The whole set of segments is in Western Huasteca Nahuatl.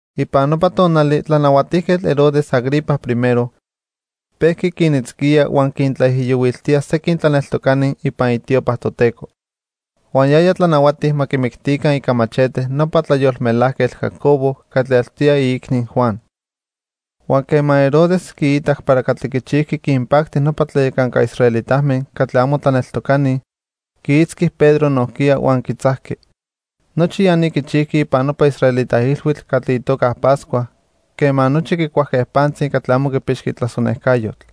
Ipan nopa tonali Tlanahuatijquetl Herodes Agripa I pejqui quinitzquía huan quintlaijiyohuiltía sequin tlaneltocani ipan itiopa Toteco. Huan yaya tlanahuati ma quimictica ica machete nopa tlayolmelajquetl Jacobo catli eltoya iicni Juan. Huan quema Herodes quiitac para catli quichijqui quinpacti nopa tlayacanca israelitame catli amo tlaneltocani, quiitzqui Pedro nojquiya huan quitzajqui. Nochi ya ni quichijqui ipan nopa israelita ilhuitl catli itoca Pascua quema nochi quicuajque pantzi catli amo quipixqui tlasonejcayotl.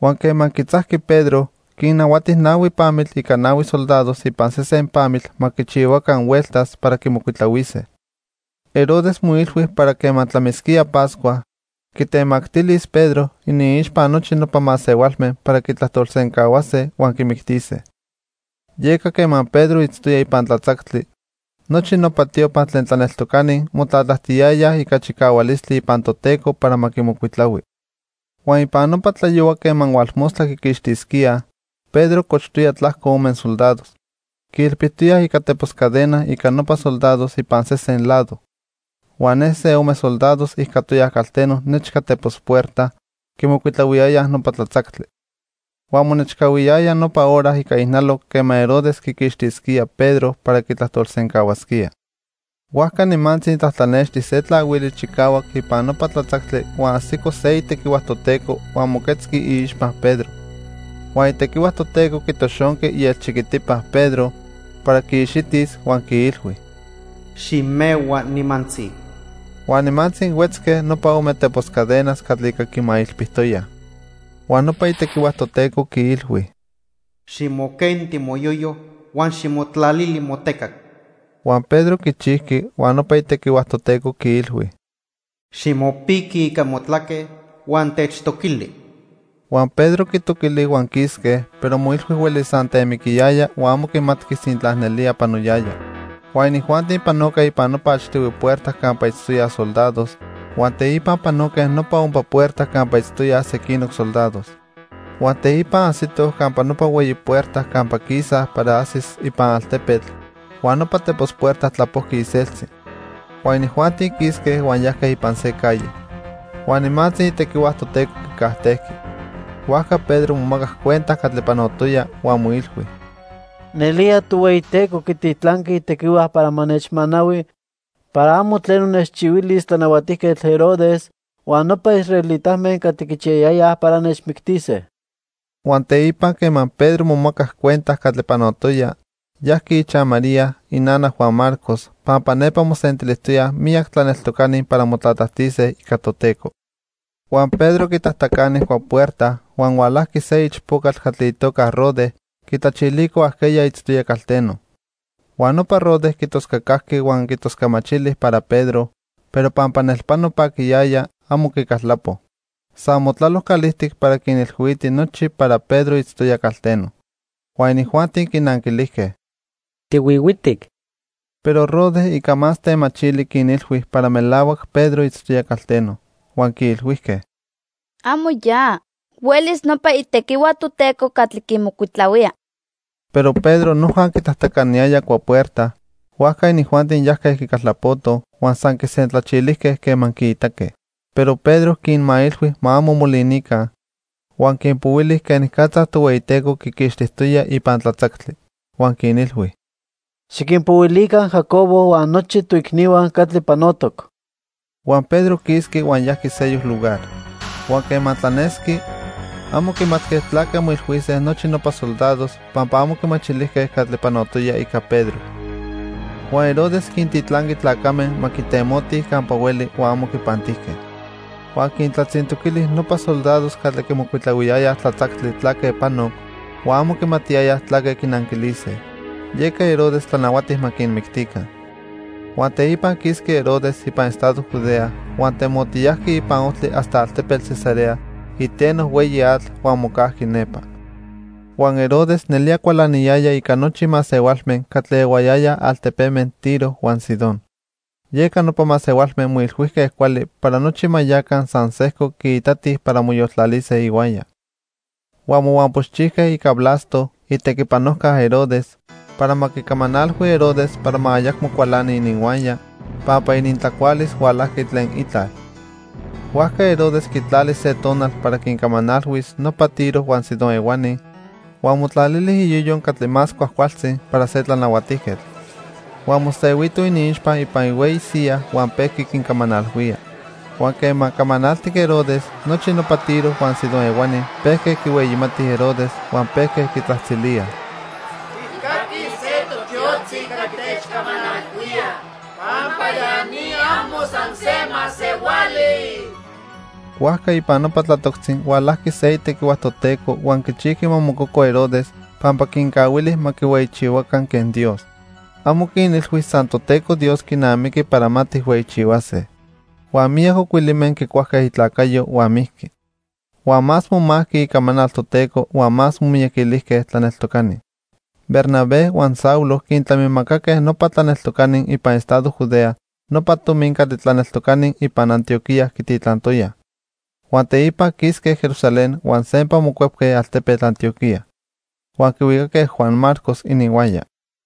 Huan quema quitzajqui Pedro, quinnahuati nahui pamitl ica nahui soldados ipan sesen pamitl ma quichihuaca hueltas para quimocuitlahuise. Herodes moilhui para quema tlamisquía Pascua, quitemactilis Pedro iniixpa nochi nopa masehualme para quitlajtolsencahuase huan quimictise. Yeca quema Pedro itztoya ipan tlatzactli, nochi nopa tiopa tlen tlaneltocani motlatlajtiyayaj ica chicahualistli ipan Toteco para ma quimocuitlahui. Huan ipan nopa tlayohua quema hualmostla quiquixtisquía, Pedro cochtoya tlajco ome soldados. Quiilpijtoya ica tepos cadena ica nopa soldados ipan sesen lado. Huan ne se ome soldados ijcatoyaj calteno nechca tepos puerta, quimocuitlahuiyayaj nopa tlatzactli. Huan monechcahuiyaya nopa hora ica ijnaloc quema Herodes quiquixtisquía Pedro para quitlajtolsencahuasquía. Huajca nimantzi tlatlanexti se tlahuili chicahuac ipan nopa tlatzactli huan ajsico se itequihua Toteco huan moquetzqui iixpa Pedro. Huan itequihua Toteco quitoxonqui ielchiquitipa Pedro para quiixitis huan quiilhui: "Ximehua nimantzi." Huan nimantzi huetzque nopa ome tepos cadenas catli ica quimailpijtoyaj. Huan nopa itequihua Toteco quiilhui: "Ximoquenti moyoyo, huan ximotlalili motecac." Huan Pedro quichijqui, huan nopa itequihua Toteco quiilhui: "Ximopiqui ica motlaque huan techtoquili." Huan Pedro quitoquili huan quisque, pero moilhui huelis san temiquiyaya huan amo quimatqui sintla nelía panoyaya. Huan inijuanti panoque ipan nopa achtihui puerta campa itztoyaj soldados, huan teipa panoque nopa ompa puerta campa itztoyaj sequinoc soldados. Huan teipa ajsitoj campa nopa hueyi puerta campa quisaj para ajsis ipan altepetl, huan nopa tepos puerta tlapojqui iseltzi. Huan inijuanti quisque huan yajque ipan se calle. Huan nimantzi itequihua Toteco quicajtejqui. Huajca Pedro momacac cuenta catli panotoya, huan moilhui: "Nelía, Tohueyiteco quititlanqui itequihua para ma nechmanahui para amo tleno nechchihuilis Tlanahuatijquetl Herodes huan nopa israelitame catli quichiyayayaj para nechmictise." Huan teipa quema Pedro momacac cuenta catli panotoya, yajqui ichaj María, inana Juan Marcos, pampa nepa mosentilijtoyaj miyac tlaneltocani para motlatlajtise ica Toteco. Huan Pedro quitajtacani cuapuerta, huan hualajqui se ichpocatl catli itoca Rode quitlachilico ajqueya itztoya calteno. Huan nopa Rode quitoscacajqui huan quitoscamachili para Pedro, pero pampa nelpano paquiyaya, amo quicaltlapo. San motlalo calijtic para quinilhuiti nochi para Pedro itztoya calteno. Huan inijuanti quinanquilijque: —¡Tihuihuitic! Pero Rode ica más temachili quinilhui para melahuac Pedro itztoya calteno. Huan quiilhuijque: —Amo ya. Huelis nopa itequihua Toteco catli quimocuitlahuía. Pero Pedro noja quitajtacaniyaya cuapuerta, huajca inijuanti yajque quicaltlapotoj, huan san quisentlachilijque quema quiitaque. Pero Pedro quinmailhui ma amo molinica, huan quinpohuili quenicatza Tohueyiteco quiquixtijtoya ipan tlatzactli. Huan quinilhui: —Xiquinpohuilica Jacobo huan nochi toicnihua catli panotoc. Huan Pedro quisqui huan yajqui sejco lugar. Huan quema tlanesqui, amo quimatque tlaque moilhuise nochi nopa soldados pampa amo quimachilijque catli panotoya ica Pedro. Huan Herodes quintitlanqui tlacame ma quitemotij campa hueli huan amo quipantijque. Huan quintlatzintoquili nopa soldados catli quimocuitlahuiyayaj tlatzactli tlaque panoc, huan amo quimatiyayaj tlaque quinanquilise, yeca Herodes tlanahuati ma quinmictica. Huan teipa quisqui Herodes ipan estado Judea huan temotiyajqui ipan ojtli hasta altepetl Cesarea iteno hueyi atl huan mocajqui nepa. Huan Herodes nelía cualaniyaya ica nochi masehualme catli ehuayayaj altepeme Tiro huan Sidón, yeca nopa masehualme moilhuijque cuali para nochi ma yaca san sejco quiitatij para moyoltlalise ihuaya. Huan mohuampoxchijque ica Blasto, itequipanojca Herodes, para ma quicamanalhui Herodes para ma ayacmo cualani ininhuaya, pampa inintlacualis hualajqui tlen itlal. Huajca Herodes quitlali se tonal para quincamanalhuis nopa Tiro huan Sidón ehuani huan motlalili iyoyo catli más cuajcualtzi para se tlanahuatijquetl. Huan mosehuito iniixpa ipan ihueyi siyaj huan pejqui quincamanalhuía. Huan quema camanaltic Herodes, nochi nopa Tiro huan Sidón ehuani pejque quihueyimatij Herodes huan pejque quitzajtzilíaj: "Tijcaquij se totiotzi catli techcamanalhuía pampa ya ni amo san se masehuali." Huajca ipan nopa tlatoctzi hualajqui se itequihua Toteco huan quichijqui ma mococo Herodes pampa quincahuili ma quihueyichihuaca quen Dios. Amo quinilhui san Toteco Dios quinamiqui para ma tijhueyichihuase. Huan miyac ocuilime quicuajque itlacayo huan mijqui. Huan más momajqui icamanal Toteco huan más momiyaquilijque tlaneltocani. Bernabé huan Saulo quintlamimacaque nopa tlaneltocani ipan estado Judea nopa tomi catli tlaneltocani ipan Antioquía quititlantoyaj. Huan teipa quisque Jerusalén huan sempa mocuepque altepetl Antioquía. Huan quihuicaque Juan Marcos ininhuaya.